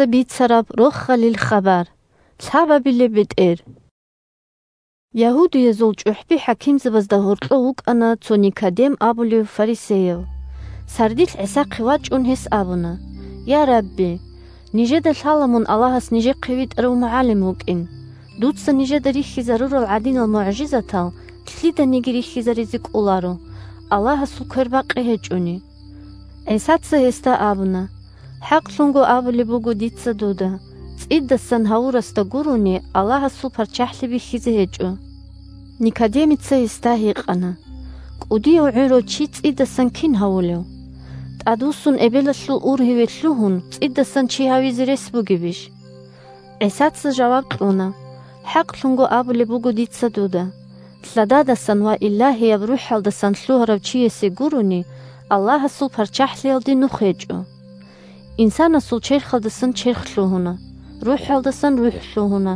бетӀер ГӀисалги Никодемилги гара-чӀвари 1Ягьудиязул чӀухӀби-хӀакимзабазда гьоркьов вукӀана цо Никодем абулев фарисеяв. 2Сардилъ ГӀисахъе вачӀун, гьес абуна: – Я, Рабби! Нижеда лъала мун Аллагьас нижехъе витӀарав МугӀалим вукӀин. Дуца нижеда рихьизарурал гӀадинал мугӀжизатал лъиданиги рихьизаризе кӀоларо, Аллагьасул квербакъи гьечӀони. 3ГӀисаца гьесда абуна: – ХӀакълъун абулеб буго дица дуда: цӀидасан гьавурасда гурони Аллагьасул ПарччахӀлъи бихьизе гьечӀо. Никодемица гьесда гьикъана: – КӀудияв гӀурав чи цӀидасан кин гьавулев? ТӀадвуссун эбелалъул ургьиве лъугьун, цӀидасан чи гьавизе рес бугебищ? ГӀисаца жаваб кьуна: – ХӀакълъун абулеб буго дица дуда: лъададасан ва Илагьияб РухӀалдасан лъугьарав чиясе гурони Аллагьасул ПарччахӀлъиялде нух гьечӀо. Инсанасул черхалдасан черх лъугьуна, рухӀалдасан рухӀ лъугьуна.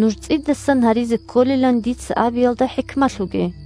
Нуж цӀидасан гьаризе кколилан дица абиялда хӀикмалъуге.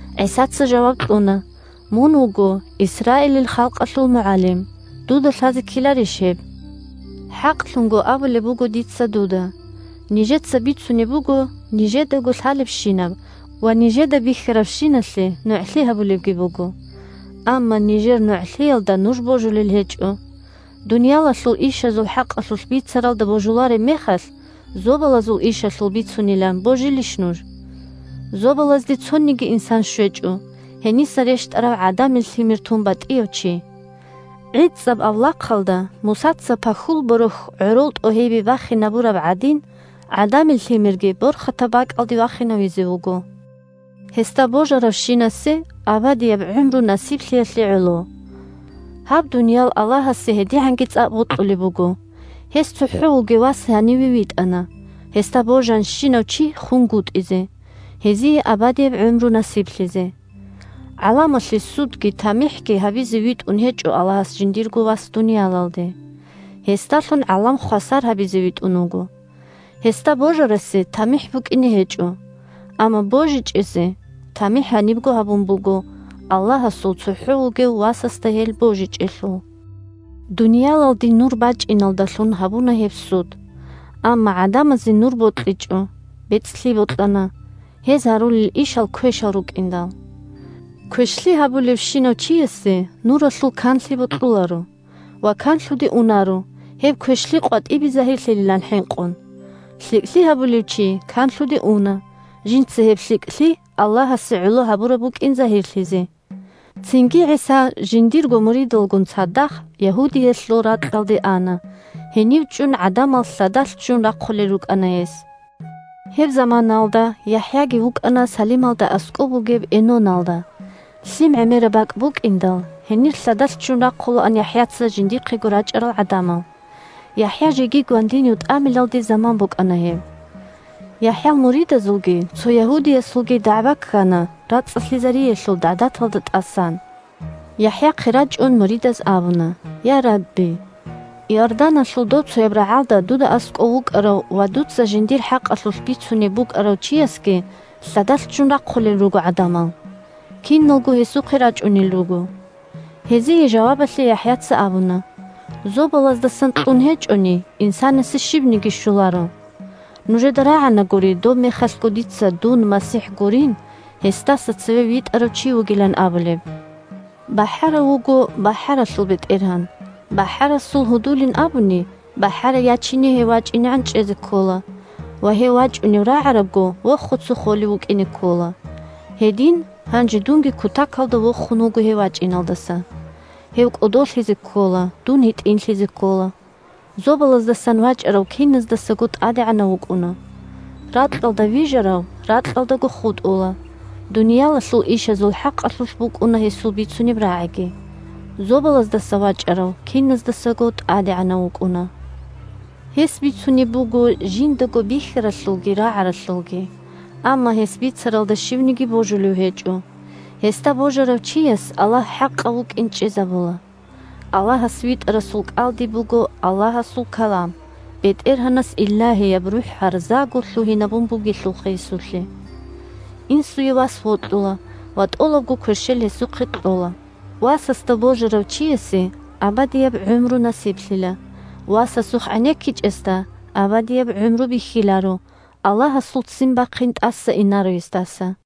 ГӀисаца жаваб кьуна: – Мун вуго Исраилил халкъалъул мугӀалим. Дуда лъазе ккеларищ гьеб? ХӀакълъун абулеб буго дица дуда: нижеца бицунеб буго нижедаго лъалебщинаб ва нижеда бихьарабщиналъе нугӀлъи гьабулебги буго. Амма нижер нугӀлъиялда нуж божулел гьечӀо. Дуниялалъул ишазул хӀакъалъулъ бицаралда божулареб мехалъ, зобалазул ишазул бицунилан божилищ нуж? Зобалазде цониги инсан щвечӀо, гьениса рещтӀарав ГӀадамил Лъимер тун батӀияв чи. ГӀицӀаб авлахъалда Мусаца пахьул борохь гӀорол тӀогьибе бахинабураб гӀадин, ГӀадамил Лъимерги борхатаб бакӀалде вахинавизе вуго, гьесда божаравщинасе абадияб гӀумру насиблъиялъе гӀоло. Гьаб дуниял Аллагьасе гьедигӀанги цӀакъ бокьулеб буго: гьес цохӀо вугев Вас гьаниве витӀана, гьесда божанщинав чи хунгутӀизе, гьезие абадияб гӀумру насиблъизе. ГӀаламалъе судги тамихӀги гьабизе витӀун гьечӀо Аллагьас жиндирго Вас дуниялалде, гьесдалъун гӀалам хвасар гьабизе витӀун вуго. Гьесда божарасе тамихӀ букӀине гьечӀо, амма божичӀезе тамихӀ гьанибго гьабун буго, Аллагьасул цохӀо вугев Васасда гьел божичӀелъул. Дуниялалде Нур бачӀиналдалъун гьабуна гьеб суд. Амма гӀадамазе Нур бокьичӀо, бецӀлъи бокьана, гьез гьарулел ишал квешал рукӀиндал. Квешлъи гьабулевщинав чиясе Нуралъул канлъи бокьуларо ва канлъуде унаро, гьеб квешлъи къватӀибе загьирлъилилан хӀинкъун. ЛъикӀлъи гьабулев чи канлъуде уна, жинца гьеб лъикӀлъи Аллагьасе гӀоло гьабураб букӀин загьирлъизе. Цинги ГӀиса жиндирго муридалгун цадахъ Ягьудиялъул ракьалде ана, гьенив чӀун гӀадамал лъадалъ ччун рахъулел рукӀана гьес. Гьеб заманаялда ЯхӀяги вукӀана Салималда аскӀоб бугеб Эноналда. Лъим гӀемераб бакӀ букӀиндал, гьенир лъадалъ ччун рахъулаан ЯхӀяца жиндихъего рачӀарал гӀадамал. ЯхӀя жеги гвандинив тӀамилалде заман букӀана гьеб. ЯхӀял муридазулги цо ягьудиясулги дагӀба ккана рацӀцӀалъизариялъул гӀадаталда тӀасан. ЯхӀяхъе рачӀун муридаз абуна: – Я, Рабби! Иорданалъул добцояб рагӀалда дуда аскӀов вукӀарав ва дуца жиндир хӀакъалъулъ бицунеб букӀарав чиясги лъадалъ ччун рахъулел руго гӀадамал. Киналго гьесухъе рачӀунел руго. Гьезие жавабалъе ЯхӀяца абуна: – Зобалаздасан кьун гьечӀони, инсанасе щибниги щоларо. Нужеда рагӀанагури добмехалъго дица дун МасихӀ гурин, гьесдаса цеве витӀарав чи вугилан абулеб. БахӀарав вуго бахӀаралъул бетӀергьан, бахӀарасул гьудулин абуни бахӀарай ячине гьев вачӀинегӀан чӀезе ккола, ва, гьев вачӀунев рагӀарабго, вохуца холев вукӀине ккола. Гьедин гьанже дунги кутакалда вохун вуго гьев вачӀиналдаса. Гьев кӀодолъизе ккола, дун гьитӀинлъизе ккола. Зобалаздасан вачӀарав киназдасаго тӀадегӀанав вукӀуна. Ракьалда вижарав ракьалдаго хутӀула, дуниялалъул ишазул хӀакъалъулъ букӀуна гьесул бицунеб рагӀиги. Зобалаздаса вачӀарав киназдасаго тӀадегӀанав вукӀуна. Гьес бицунеб буго жиндаго бихьаралъулги рагӀаралъулги. Амма гьес бицаралда щивниги божулев гьечӀо. Гьесда божарав чияс Аллагь хӀакъав вукӀин чӀезабула. Аллагьас витӀарасул кӀалдиб буго Аллагьасул калам, БетӀергьанас Илагьияб РухӀ гьарзаго лъугьинабун бугелъулха гьесулъе. Инсуе вас вокьула ва тӀолабго кверщел гьесухъе кьола. Васасда божарав чиясе абадияб гӀумру насиблъила. Васасухъ гӀенеккичӀесда абадияб гӀумру бихьиларо, Аллагьасул ццин бахъин тӀаса инаро гьесдаса.